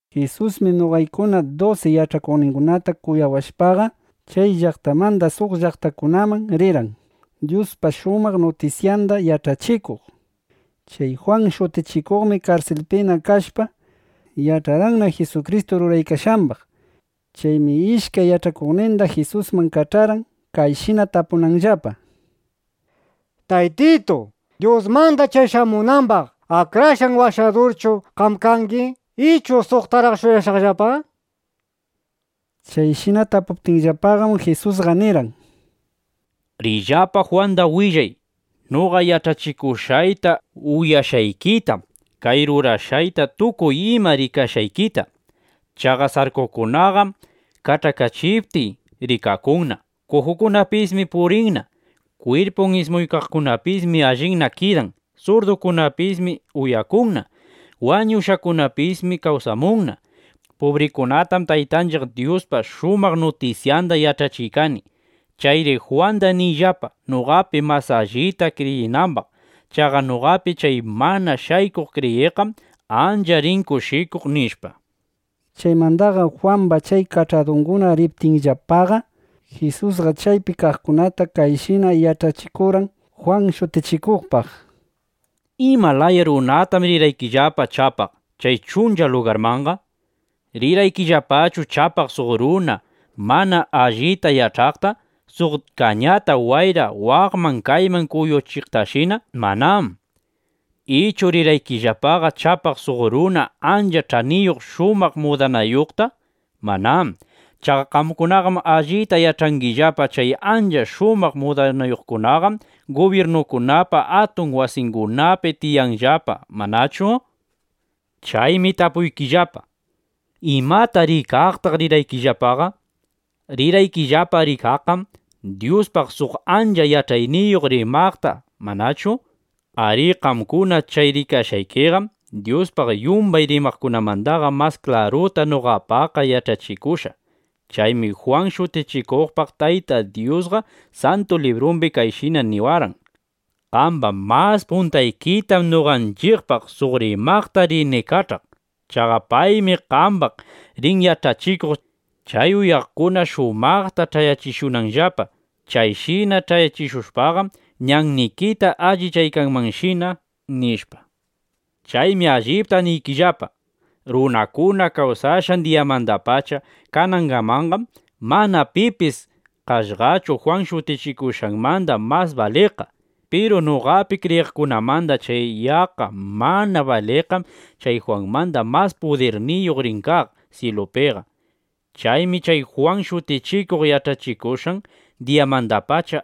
Jisusmi noqaykuna dusi yach'akuqningunata kunawashpaqa, chay llaqtamanda suq llaqtakunamanna rirqan, Dyuspa shumaq nutisyanda yach'achikuq. Chay Jwan Shutichikuqmi karsilpina kashpa, yach'arqanna Jisukristu ruraykashqambaq. Chaymi ishkay yach'akuqninda Jisusman kach'arqan, kayshina tapunanllapa: —Taytitu, ¿Dyusmanda chay shamunambaq Akrashqan Washadurqachu qam kangi, ichu suqtaraq shuyashaqllapa? nishpa. Chayshina tapuptinllapaqam, Jisusqa nirqan: —Riyllapa, Jwanda willay noqa yach'achikushqayta uyashqaykita, kay rurashqayta tukuy ima rikashqaykita. Chaqa sarkukunaqam kach'akachiptiy rikakunna. Kujukunapismi purinna. Kwirpun ismuykaqkunapismi allinna kidan. Surdukunapismi uyakunna. Wañushqakunapismi kawsamunna. Pubrikunatam Taytanchiq Dyuspa shumaq nutisyanda yach'achiykani. (Chayri Jwanda niyllapa, noqapi mas allita kriyinambaq.) Chaqa noqapi chay mana shaykuq kriyiqqam ancha rin kushikuq, nishpa. Chaymandaqam Jwamba chay kach'adunguna riptinllapaqa, Jisusqa chaypi kaqkunata kayshina yach'achikurqan Jwan Shutichikuqpaq: —¿Ima laya runatam rirqaykillapa chapaq chay chuncha lugarmanqa? ¿Rirqaykillapachu chapaq suq runa mana alli yach'aqta, suq kañata wayra waqman kayman kuyuchiqtashina? Manám. Ichu ¿rirqaykillapaqa chapaq suq runa ancha ch'aniyuq shumaq mudanayuqta? Manám. Chaqa qamkunaqam allita yach'angillapa, chay ancha shumaq mudanayuqkunaqam gubyirnukunapa atun wasingunapi tiyanllapa, ¿manachu? Chaymi tapuykillapa: ¿imata rikaqtaq rirqaykillapaqa? Rirqaykillapa rikaqqam Dyuspaq suq ancha yach'ayniyuq rimaqta, ¿manachu? Arí, qamkuna chay rikashqaykiqam Dyuspaq yumbay rimaqkunamandaqa mas klaruta noqapaqqa yach'achikushqa. Chaymi Jwan Shutichikuqpaq Taytay Dyusqa Santu Librumbi kayshina niwarqan: Qamba mas puntaykitam noqanchiqpaq suq rimaqta rini kach'aq. Chaqa paymi qambaq rin yach'achikuq, chay uyaqkuna shumaqta ch'ayachishunanllapa. Chayshina yach'achikushpaqam, ñannikita allichaykanmanshina, nishpa. Chaymi allipta niykillapa, runakuna kawsashqan diyamandapacha kanangamanqam, mana pipis kashqachu Jwan Shutichikuqmanda mas baliqqa. Piru noqapi kriyiqkunamanda chay yaqqa mana baliqqam chay Jwanmanda mas pudirniyuq rin kaq syilupiqa. ’Chaymi chay Jwan Shutichikuq yach'achikushqan diyamandapacha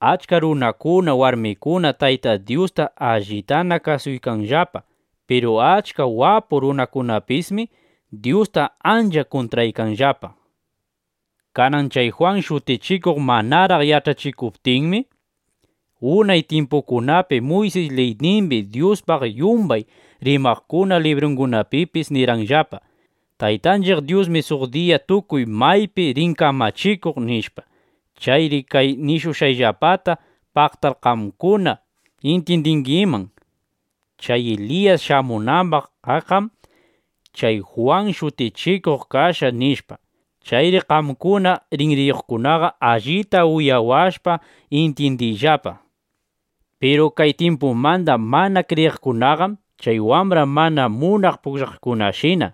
achka runakuna, warmikuna Tayta Dyusta allitana kasuykanllapa. Piru achka wapu runakunapismi Dyusta ancha kuntraykanllapa. Kanan chay Jwan Shutichikuq manaraq yach'achikuptinmi, unay tyimpukunapi Muysis liynimbi, Dyuspaq yumbay rimaqkuna librungunapipis nirqanllapa: “Taytanchiq Dyusmi suq diya tukuy maypi rin kamachikuq”, nishpa. Chayri kay nishushqayllapata paqtar qamkuna intyindingiman: Chay Eliyas shamunambaq kaqqam chay Jwan Shutichikuq kashqa, nishpa. Chayri qamkuna rinriyuqkunaqa, allita uyawashpa intyindiyllapa. ’Piru kay tyimpumanda mana kriyiqkunaqam chay wambra mana munaq pugllaqkunashina.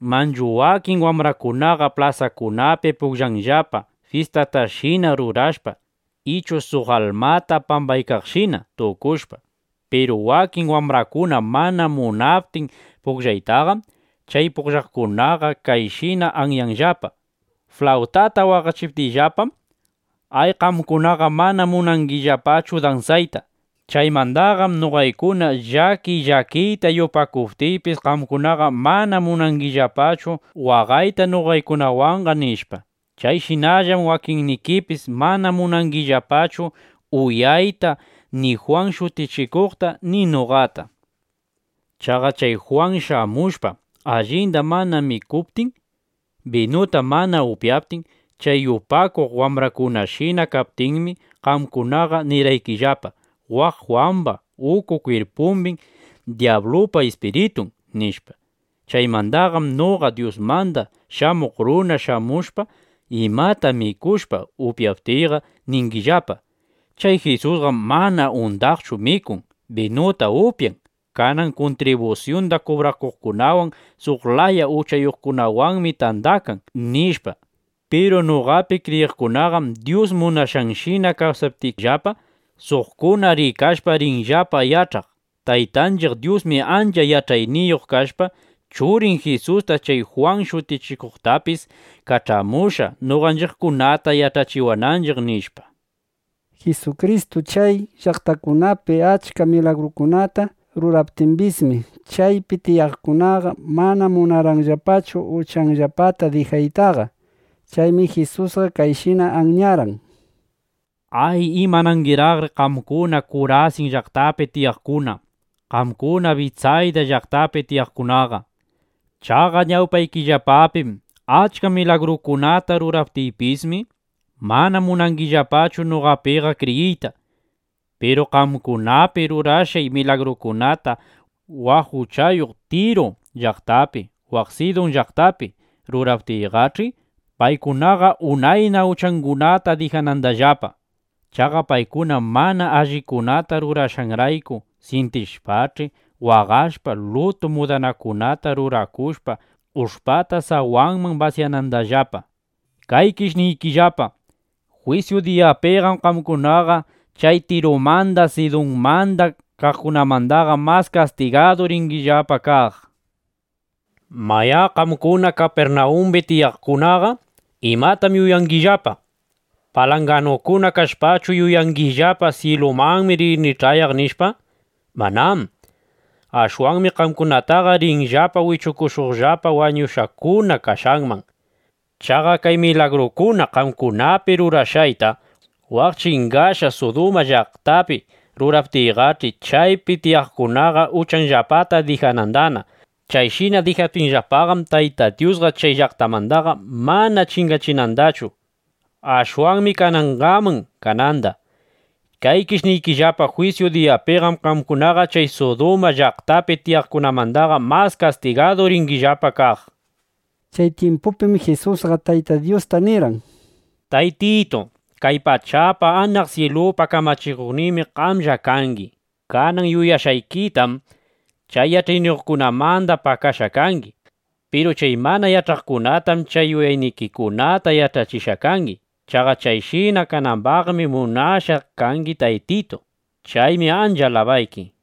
Manchu wakin wambrakunaqa plasakunapi pugllanllapa, fyistatashina rurashpa ichu suq almata pambaykaqshina tukushpa. Piru wakin wambrakuna mana munaptin pugllaytaqam, chay pugllaqkunaqa kayshina anyanllapa: “Flawtata waqachiptiyllapam, ay, qamkunaqa mana munangillapachu dansayta. Chaymandaqam noqaykuna llakiy llakiyta yupakuptiypis, qamkunaqa mana munangillapachu waqayta noqaykunawanqa”, nishpa. (Chayshinallam wakinnikipis mana munangillapachu uyayta ni Jwan Shutichikuqta ni noqata.) Chaqa chay Jwan shamushpa, allinda mana mikuptin, binuta mana upyaptin, chay yupakuq wambrakunashina kaptinmi, qamkunaqa nirqaykillapa: “Waq Jwamba uku kwirpumbim dyablupa ispiritun”, nishpa. Chaymandaqam noqa Dyusmanda Shamuq Runa shamushpa, imata mikushpa upyaptiyqa, ningillapa: “Chay Jisusqam mana undaqchu mikun, binuta upyan. Kanan kuntribusyunda kubrakuqkunawan suq laya uchayuqkunawanmi tandakan”, nishpa. Piru noqapi kriyiqkunaqam Dyus munashqanshina kawsaptinllapa, suqkuna rikashpa rinllapa yach'aq: Taytanchiq Dyusmi ancha yach'ayniyuq kashpa, Churin Jisusta, chay Jwan Shutichikuqtapis kach'amushqa, noqanchiqkunata yach'achiwananchiq, nishpa. Jisukristu chay llaqtakunapi achka milagrukunata ruraptimbismi, chaypi tiyaqkunaqa mana munarqanllapachu uchanllapata dijaytaqa. Chaymi Jisusqa kayshina anyarqan: —¡Ay, imanangiraqri qamkuna Kurasin llaqtapi tiyaqkuna, qamkuna Bitsayda llaqtapi tiyaqkunaqa! Chaqa ñawpaykillapapim achka milagrukunata ruraptiypismi, mana munangillapachu noqapiqa kriyiyta. Piru qamkunapi rurashqay milagrukunata waq uchayuq Tiru llaqtapi, waq Sidun llaqtapi ruraptiyqach'i, paykunaqa unayna uchangunata dijanandallapa. Chaqa paykuna mana allikunata rurashqanrayku syintishpach'i, waqashpa, lutu mudanakunata rurakushpa, ush'pata sawanman basyanandallapa. Kaykish niykillapa, jwisyu diyapiqam qamkunaqa chay Tirumanda Sidunmanda kaqkunamandaqa mas kastigadu ringillapa kaq. ’Mayá, qamkuna Kapirnawumbi tiyaqkunaqa, ¿imatam yuyangillapa? ¿Palanganukuna kashpachu yuyangillapa: Syilumanmi rini ch'ayaq, nishpa? ¡Manám! Ashwanmi qamkunataqa rinllapa wichushuqllapa wañushqakuna kashqanman. Chaqa kay milagrukuna qamkunapi rurashqayta waq chingachishqa Suduma llaqtapi ruraptiyqach'i, chaypi tiyaqkunaqa uchanllapataqa dijanandana. Chayshina dijaptinllapaqam, Tayta Dyusqa chay llaqtandaqa mana chingachinandachu. Ashwanmi kanangaman kananda. Kaykish niykillapa, jwisyu diyapiqam qamkunaqa chay Suduma llaqtapi tiyaqkunamandaqa mas kastigadu ringillapa kaq, nishpa. Chay tyimpupim Jisusqa Tayta Dyusta nirqan: —Taytitu, kay pachapa, anaq syilupa kamachikuqninmi qamlla kangi. Kanan yuyashqaykitam chay yach'ayniyuqkunamanda pakashqa kangi. Piru chay mana yach'aqkunatam chay yuyaynikikunata yach'achishqa kangi. Chaqa chayshina kanambaqmi munashqa kangi, Taytitu. Chaymi ancha alabayki.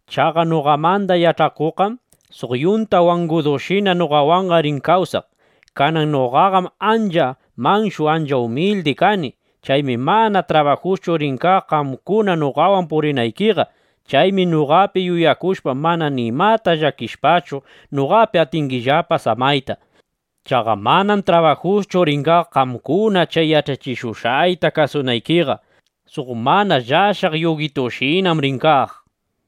Chaqa noqamanda yach'akuqqam suq yunta wangudushina noqawanqa rin kawsaq. Kanan noqaqam ancha manshu ancha umildi kani. Chaymi mana trabajuschu rin kaq qamkuna noqawan purinaykiqa. Chaymi noqapi yuyakushpa, mana nimata llakishpachu, noqapina atingillapa samayta. Chaqa manam trabajuschu rin kaq qamkuna chay yach'achishushqayta kasunaykiqa. Suq mana llashaq yugitushinam rin kaq, nishpa.